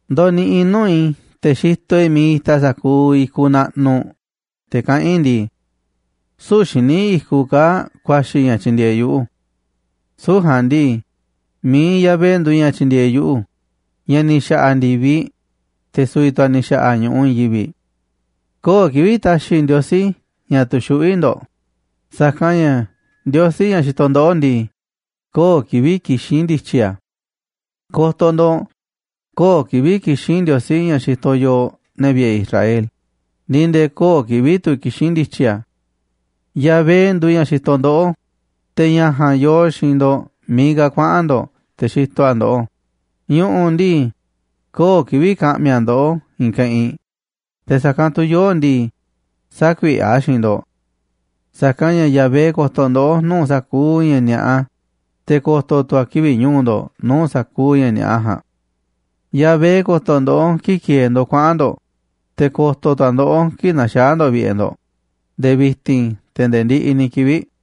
Ndoniꞌiꞌ i̱ nuu̱ꞌ i̱ te̱ xitoꞌ i̱ miiꞌ itaꞌ sa̱kuuꞌ i̱kuꞌ naꞌnuꞌ, te̱ kaꞌán i̱ ndii: “Süu̱ꞌ xíniꞌ i̱kuꞌ kaa̱ꞌ ku̱a̱xi̱ ña̱ tyindieeꞌ yuꞌu̱. Süu̱ꞌ ja̱a̱nꞌ ndii, mi̱iꞌ Yahvé nduuꞌ ña̱ tyindieeꞌ yuꞌu̱, ña̱ ni̱ xa̱ꞌa̱ ndi̱viꞌ, te̱ su̱vi̱ tu̱ a̱ ni̱ xa̱ꞌa̱ ñu̱ꞌuꞌ i̱i̱n yivi̱ꞌ.” Köo̱ꞌ kivi̱ꞌ ta̱xi̱ Ndiosí ña̱ tu̱xuꞌví ndo̱ꞌ, sa̱kanꞌ ña̱ Ndiosí, ña̱ xitoꞌ ndoꞌó ndii, köo̱ꞌ kivi̱ꞌ kixín ndi̱tyi̱ a̱. Ko̱to̱ ndo̱ꞌ, köo̱ꞌ kivi̱ꞌ kixín Ndiosí ña̱ xitoꞌ yooꞌ, ne̱ vi̱ꞌe̱ Israel, ni̱ nde̱e̱ köo̱ꞌ kivi̱ꞌ tu̱ kixín ndi̱tyi̱ a̱. Yahvé nduuꞌ ña̱ xitoꞌ ndoꞌó, te̱ ña̱ ja̱a̱nꞌ yoo xi̱i̱nꞌ ndo̱ꞌ miiꞌ ka̱ kuaꞌa̱n ndo̱ꞌ, te̱ xitoꞌ a̱ ndoꞌó. Ñu̱ꞌu̱ ndii, köo̱ꞌ kivi̱ꞌ ka̱ꞌmi̱ a̱ ndoꞌó i̱i̱n keꞌinꞌ, te̱ sa̱kanꞌ tu̱ yoo̱ꞌ ndii, sä̱kuiꞌe̱ a̱ xiinꞌ ndo̱ꞌ. Sa̱kanꞌ ña̱ Yahvé ko̱to̱ ndoꞌó nuu̱ꞌ sa̱kuuꞌ ña̱ ni̱a̱ꞌa, te̱ ko̱to̱ tu̱ a̱ kivi̱ꞌ ñu̱u̱ ndo̱ꞌ nuu̱ꞌ sa̱kuuꞌ ña̱ ni̱a̱ꞌa ja̱a̱nꞌ. Yahvé ko̱to̱ ndoꞌó kii̱ꞌ ki̱e̱e̱ ndo̱ꞌ kuaꞌa̱n ndo̱ꞌ, te̱ ko̱to̱ tu̱ a̱ ndoꞌó kii̱ꞌ na̱xaa̱ ndo̱ꞌ vi̱ꞌe̱ ndo̱ꞌ, nde̱e̱ vi̱ti̱n te̱ nde̱e̱ ndiꞌiꞌ ni̱ kivi̱ꞌ.